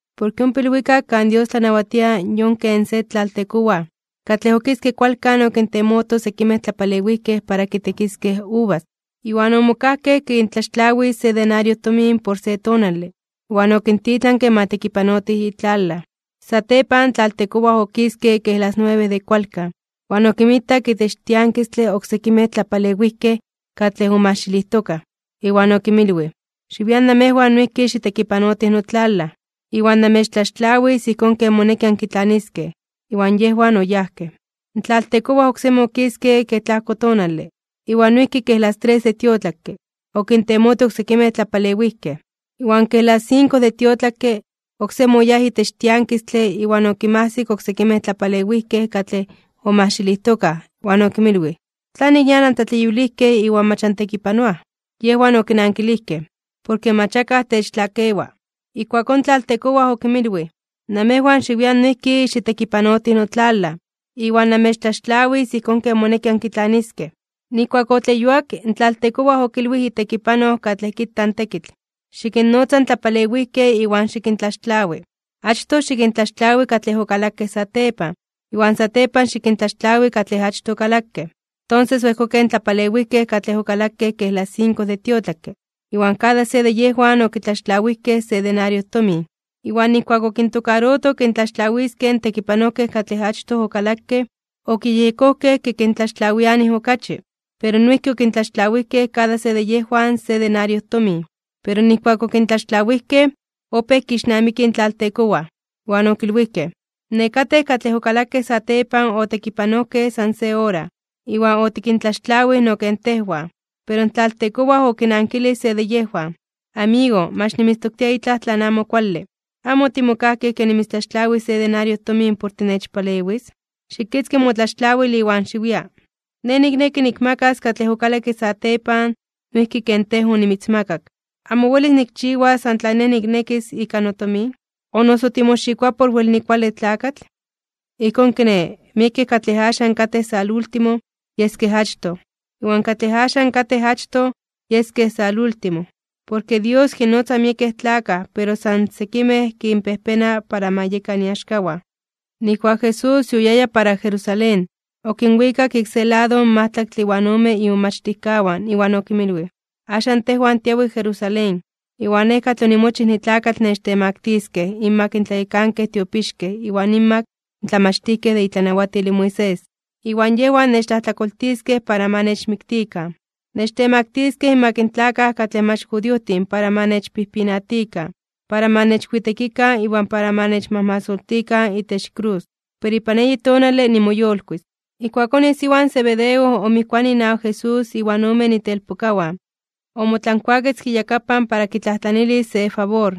’Porke ompa ilwikak kan Dios tlanawatia yon ken se tlaltekowaj, katlej okiske kualkan okintemoto sekimej tlapalewijkej para kitekiskej uvas. Iwan omokajkej kintlaxtlawis se denario tomin por se tonale. Iwan okintitlanke ma tekipanotij itlalaj. Satepan in tlaltekowaj okiske kej las nuebe de kualkan, iwan okinmitak itech tiankistle oksekimej tlapalewijkej katlej omajxilijtokaj. Iwan okinmilwij: “Xiwian namejwan noijki xitekipanotij notlalaj, iwan namechtlaxtlawis ijkón ken moneki ankitlaniskej.” Iwan yejwan oyajkej. In tlaltekowaj oksemi okiske kej tlajko tonale, iwan noijki kej las tres de tiotlakke, okintemoto oksekimej tlapalewijkej. Iwan kej las sinko de tiotlakke, oksemi oyáj itech tiankistle iwan okinmajsik oksekimej tlapalewijkej katlej omajxilijtokaj, iwan okinmilwij: “¿Tlanik nian antleyuilijkej iwan mach antekipanoaj?” Yejwan okinankilijkej: “Porke mach akaj techtlakewa.” Ijkuakón in tlaltekowaj okinmilwij: “Namejwan xiwian noijki xitekipanotij notlalaj, iwan namechtlaxtlawis ijkón ken moneki ankitlaniskej.” Nijkuak otleyuak, in tlaltekowaj okilwij itekipanoj katlej kita in tekitl: “Xikinnotza in tlapalewijkej iwan xikintlaxtlawi, achtoj xikintlaxtlawi katlej okalakej satepan, iwan satepan xikintlaxtlawi katlej achtoj okalakej.” Tonses oejkokej in tlapalewijkej katlej okalakej kej las sinko de tiotlakke, iwan kada se de yejwan okitlaxtlawijkej se denario tomin. Iwan nijkuak okintokaroto kintlaxtlawiskej in tekipanojkej katlej achtoj okalakej, okiyejyekojkej kintlaxtlawianij okachi. Pero noijki okintlaxtlawijkej kada se de yejwan se denario tomin. Pero nijkuak okintlaxtlawijkej, opéj kixnamikij in tlaltekowaj, iwan okilwijkej: “Nekatej katlej okalakej satepan otekipanojkej san se ora, iwan otikintlaxtlawij no ken tejwan.” Pero in tlaltekowaj okinankilij se de yejwan: “Amigo, mach nimitztoktia itlaj tlan amo kuale. ¿Amo otimokajkej ke nimitztlaxtlawis se denario tomin por tinechpalewis? Xikitzki motlaxtlawil iwan xiwia. Nej nikneki nikmakas katlej okalakke satepan noijki ken tej onimitzmakak. ¿Amo welis nikchiwas san tlan nej niknekis ika notomin? ¿O noso timoxikoa por wel nikuale tlakatl?” ’Ijkón kiné, miekej katlej axan katej salúltimo, yeskej achtoj. Iwan katlej axan katej achtoj, yeskej salúltimo. Porke Dios kinnotza miekej tlakaj pero san sekimej kinpejpena para ma yekan iaxkawan. Nijkuak Jesús yoyaya para Jerusalén, okinwikak ik se lado in majtlaktle iwan ome imomachtijkawan iwan okinmilwij: ―Axan tejwan tiawij Jerusalén. Iwan Nej katlej onimochij nitlakatl nechtemaktiskej (nechtemaktiliskej) inmak in tlayekankej tiopixkej iwan inmak in tlamachtijkej de itlanawatil in Moisés. Iwan yejwan nechtlajtlakoltiskej para ma nechmiktikan. Nechtemaktiskej inmak in tlakaj katlej mach judiojtin para ma nechpijpinatikan, para ma nechwitekikan iwan para ma nechmajmasoltikan itech krus. Pero ipan eyi tonale nimoyolkuis (nimoyolitis). Ijkuakón isiwa in Zebedeo, omijkuanij inawak Jesús inwan omen itelpokawan, omotlankuaketzke iyakapan para kitlajtlanilis se favor.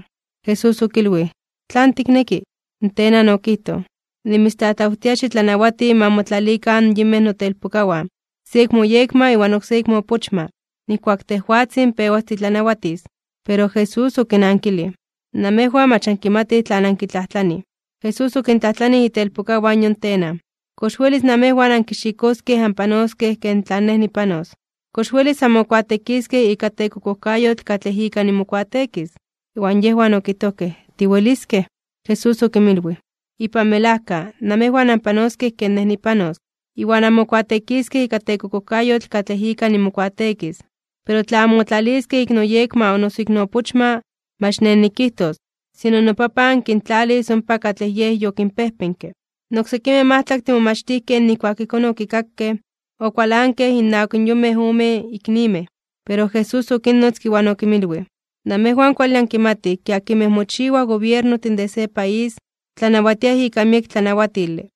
Jesús okilwij: ―¿Tlan tikneki? In tenan okijtoj: ―Nimitztlatlawtia xitlanawati ma motlalikan in yinmej notelpokawan, se ik moyekma iwan oksé ik moopochma, nijkuak tejwatzin pewas titlanawatis. Pero Jesús okinankilij: ―Namejwan mach ankimatij tlan ankitlajtlanij. Jesús okintlajtlanij itelpokawan in yon tenan: ―¿Kox welis namejwan ankixikoskej anpanoskej ken tlan Nej nipanos? ¿Kox welis anmokuateekiskej ika tekokojkayotl katlej ika nimokuateekis? Iwan yejwan okijtojkej: ―Tiweliskej. Jesús okinmilwij: ―Ipan melajka, namejwan anpanoskej ken Nej nipanos, iwan anmokuateekiskej ika tekokojkayotl katlej ika nimokuateekis. Pero tla anmotlaliskej ik noyekma o noso ik noopochma, mach Nej nikijtos, sino noPapan kintlalis ompa katlej Yej yokinpejpenke. In oksekimej majtlaktin momachtijkej nijkuak ijkón okikakej, okualankej innawak in yonmej omen iknimej. Pero Jesús okinnotzke, iwan okinmilwij: ―Namejwan kuale ankimatij ke akinmej mochiwaj gobiernojtin de se país, tlanawatiaj ika miek tlanawatile.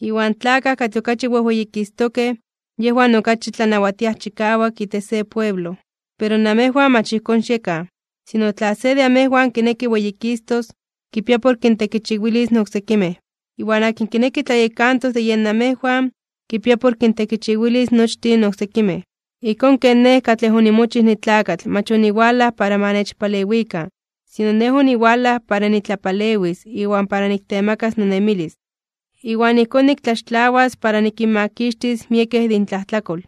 Iwan tlakaj katlej okachi weyikistokej (weyititokej), yejwan okachi tlanawatiaj chikawak itech se pueblo. Pero namejwan mach ijkón xiekan, sino tla se de amejwan kineki weyikistos, kipia por kintekichiwilis in oksekimej. Iwan akin kineki tlayekantos de yen namejwan, kipia por kintekichiwilis nochtin in oksekimej, ijkón ken Nej katlej onimochij nitlakatl mach oniwalaj para ma nechpalewikan, sino Nej oniwalaj para nitlapalewis iwan para niktemakas nonemilis, iwan ijkón niktlaxtlawas para nikinmakixtis miekej de intlajtlakol.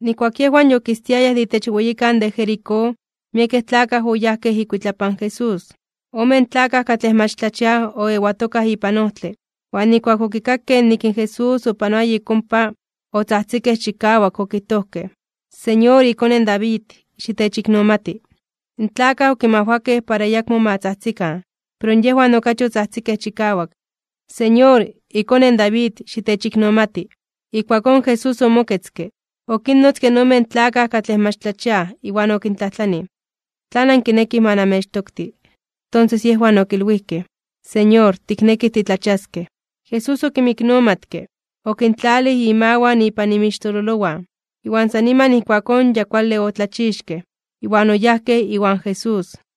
Nijkuak yejwan yokistiayaj de itech weyikan de Jericó, miekej tlakaj oyajkej ikuitlapan Jesús. Omen tlakaj katlej mach tlachiaj oewatokaj ipan ojtle, iwan nijkuak okikakej nik in Jesús opanoaya ik ompa, otzajtzikej chikawak okijtojkej: ―Señor, iKone in David, xitechiknomati. In tlakaj okinmajwakej para ayakmo ma tzajtzikan, pero yejwan okachi otzajtzikej chikawak: ―Señor, iKone in David, xitechiknomati. Ijkuakón Jesús omoketzke, okinnotzke in omen tlakaj katlej mach tlachiaj, iwan okintlajtlanij: ―¿Tlan ankinekij ma namechtokti? Tonses yejwan okilwijkej: ―Señor, tiknekij titlachiaskej. Jesús okinmiknomatke, okintlalij imawan ipan inmixtololowan, iwan san niman ijkuakón ya kuale otlachixkej, iwan oyajkej iwan Jesús.